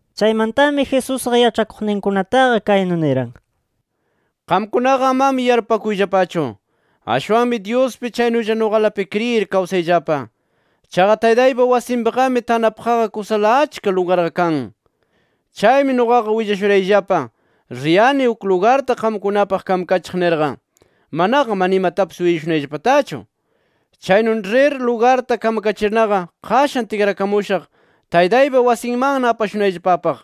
Chaymantami Jesusqa yaĉhakuqninkunataqa kaynu niran: “Qamkunaqa amami yarpupakuyllapachu. Ashwanmi Dyuspi chaynulla nuqalapi kriyir kawsayllapa. Chaqa Taytaypa wasinpiqami tanapaqqa kusala achka lugarqa kan. Chaymi nuqaqa willashurayllapa, riyani uk lugarta qamkunapaq kamakachiq nirqa. Manaqa mana imatapis willashunayllapatachu. Chaynu rir lugarta kamkachirnaqa, qashan tikrakamushaq Taytaypa wasinmanna apashunayllapapaq.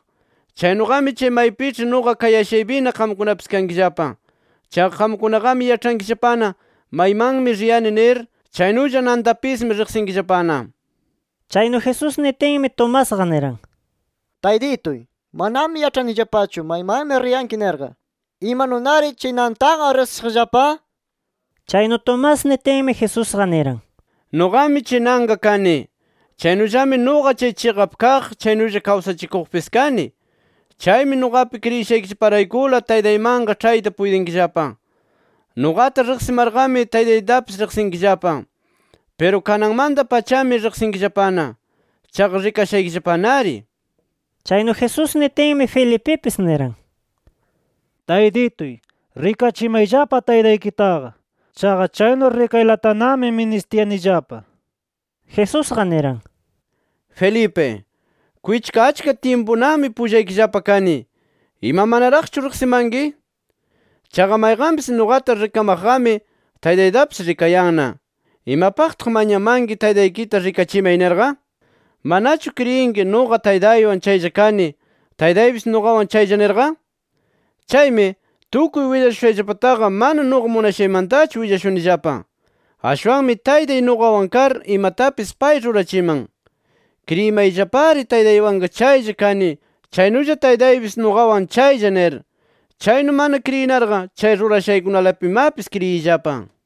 Chaynuqami chay maypiĉhi nuqa kayashaypina qamkunapis kankillapa. Chaqa qamkunaqami yaĉhankillapana maymanmi riyani nir chaynulla nantapismi riqsinkillapana”. Chaynu Jesús nitinmi, Tomasqa niran: —Taytituy, manami yaĉhayanillapachu, maymanmi riyanki nirqa. ¿Imanunari chay nantaqa riqsishaqllapa? nir. Chaynu Tomás nitinmi, Jesusqa niran: —Nuqami chay nanqa kani. Chaynullami nuqa chay chiqap kaq, chaynulla kawsachikuqpis kani. Chaymi nuqapi kriyishaykillaparaykula Taytaymanqa ĉhayta puytinkillapa. Nuqata riqsimarqami, Taytaytapis riqsinkillapa. Piru kananmanta-pachami riqsinkillapana. Chaqa rikashaykillapanari nir. Chaynu Jesús nitinmi, Felipipis niran: —Taytituy, rikachimayllapa Taytaykitaqa. Chaqa chaynu rikaylatanami ministiyanillapa nir. Jesusqa niran: —Felipe, kwichka achka tyimpunami pullaykillapa kani. Ima, ¿manaraqchu riqsimanki? Chaqa mayqanpis nuqata rikamaqqami Taytaytapis rikayanna. ¿Imapaqtaq mañamanki, ‘Taytaykita rikachimay’ nirqa? ¿Manachu kriyinki nuqa Taytaywan chaylla kani, Taytaypis nuqawan chaylla nirqa? Chaymi, tukuy willashushayllapataqa, mana nuqa munashaymantachu willashunillapa. Ashwanmi Taytay nuqawan kar, imatapis pay rurachiman. Kriyimayllapari Taytaywanqa chaylla kani, chaynulla Taytaypis nuqawan chaylla nir. Chaynu mana kriyinarqa, chay rurashaykunalapimapis kriyiyllapa.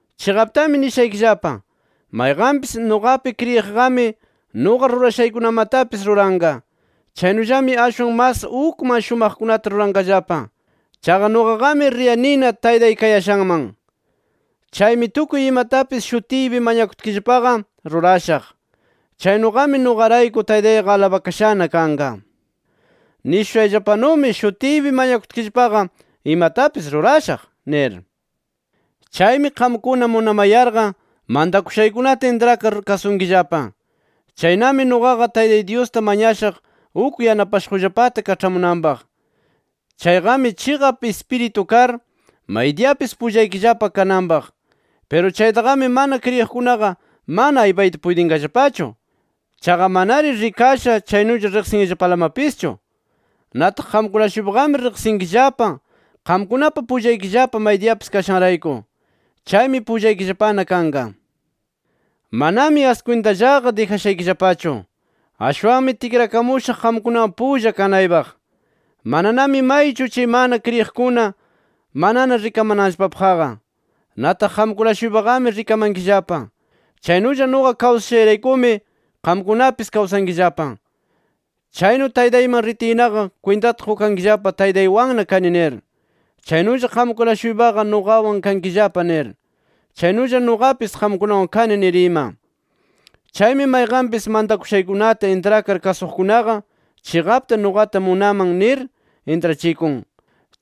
“Chiqaptami nishaykillapa: Mayqanpis nuqapi kriyiqqami nuqa rurashaykunamatapis ruranqa. Chaynullami ashwan mas ukman shumaqkunata ruranqallapa. Chaqa nuqaqami riyanina Taytay kayashanman. Chaymi tukuy imatapis shutiypi mañakutkillapaqa, rurashaq. Chaynuqami, nuqarayku Taytayqa alabakashana kanqa. Nishushayllapanumi, shutiypi mañakutkillapaqa imatapis rurashaq nir. “Chaymi qamkuna munamayarqa, mantakushaykunata intrakar kasunkillapa. Chaynami nuqaqa Taytay Dyusta mañashaq uk Yanapashuqllapata kaĉhamunanpaq. Chayqami Chiqap Ispiritu kar, maydiyapis pullaykillapa kananpaq. Piru chaytaqami mana kriyiqkunaqa mana aypayta puytinqallapachu. Chaqa manari rikasha chaynulla riqsinllapalamapischu. Nataq qamkuna-shuypaqami riqsinkillapa, qamkunapa pullaykillapa maydiyapis kashanrayku. Chaymi pullaykillapana kanqa. “Manami askwintallaqa dijashaykillapachu. Ashwanmi tikrakamushaq qamkunawan pulla kanaypaq. Mananami maychu, chay mana kriyiqkuna, manana rikamananllapapaqqa. Nataq qamkuna-shuypaqami rikamankillapa. Chaynulla nuqa kawsashayraykumi, qamkunapis kawsankillapa. Chaynu Taytayman ritiynaqa, kwintata qukankillapa, Taytaywanna kani nir. Chaynulla qamkuna-shuypaqa nuqawan kankillapa nir, chaynulla nuqapis qamkunawan kani nir ima. Chaymi mayqanpis mantakushaykunata intrakar kasuqkunaqa, chiqapta nuqata munaman nir intrachikun.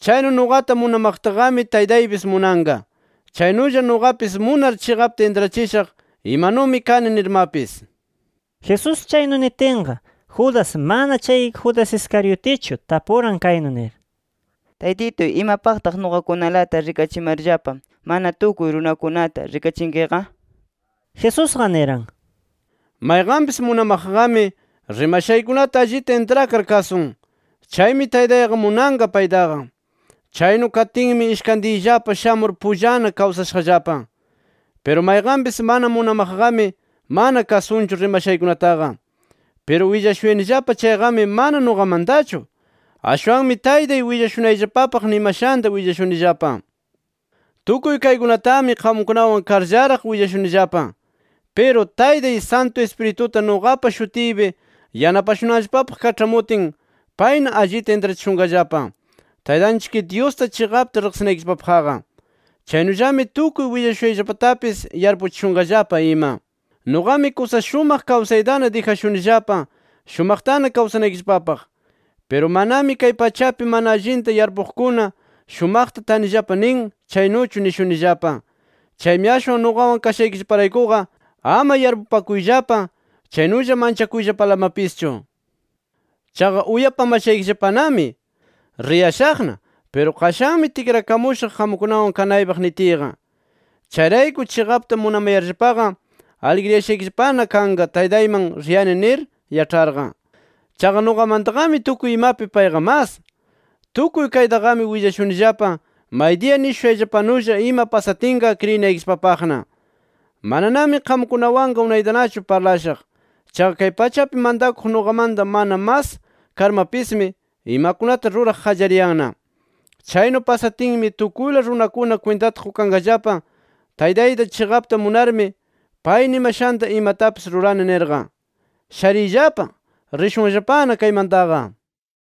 Chaynu nuqata munamaqtaqami Taytaypis munanqa. Chaynulla nuqapis munar chiqapta intrachishaq imanumi kani nirmapis”. Jesús chaynu nitinqa Judas (mana chay Judas Iscariotichu), tapuran kaynu nir: —Taytituy, ¿imapaqtaq nuqakunalata rikachimarllapa, mana tukuy runakunata rikachinkiqa? Jesusqa niran: —Mayqanpis munamaqqami, rimashaykunata allita intrakar kasun. Chaymi Taytayqa munanqa paytaqa. Chaynu katinmi, ishkantiyllapa shamur pullana kawsashaqllapa. Piru mayqanpis mana munamaqqami, mana kasunchu rimashaykunataqa. Piru willashuyanillapa chayqami mana nuqamantachu. Ashwanmi Taytay willashunayllapapaq nimashanta willashunillapa. “Tukuy kaykunatami qamkunawan karllaraq willashunillapa. Piru Taytay, Santu Ispirituta nuqapa shutiypi yanapashunanllapapaq kaĉhamutin, payna allita intrachishunqallapa, Taytanchik Dyusta chiqapta riqsinaykillapapaqqa. Chaynullami tukuy willashushayllapatapis yarpuchishunqallapa ima. “Nuqami kusa shumaq kawsaytana dijashunillapa, shumaqtana kawsanaykillapapaq. Piru manami kay pachapi mana allinta yarpuqkuna shumaqta tanillapa nin, chaynuchu nishunillapa. Chaymi ashwan nuqawan kashaykillaparaykuqa ama yarpupakuyllapa chaynulla manchakuyllapalamapischu. Chaqa uyapamashaykillapanami, ‘Riyashaqna, piru qashanmi tikrakamushaq qamkunawan kanaypaq’ nitiyqa. Chayrayku, chiqapta munamayarllapaqa, aligriyashaykillapana kanqa Taytayman riyani nir yaĉharqa. Chaqa nuqamantaqami tukuy imapi payqa mas. Tukuy kaytaqami willashunillapa, maydiya nishushayllapanulla ima pasatinqa, kriyinaykillapapaqna. “Mananami qamkunawanqa unaytanachu parlashaq. Chaqa kay pachapi mantakuq nuqamanta mana mas karmapismi, imakunata ruraq qallariyanna. Chaynu pasatinmi, tukuyla runakuna kwintata qukanqallapa Taytayta chiqapta munarmi, pay nimashanta imatapis rurani nirqa. “Shariyllapa. Rishunllapana kaymantaqa”.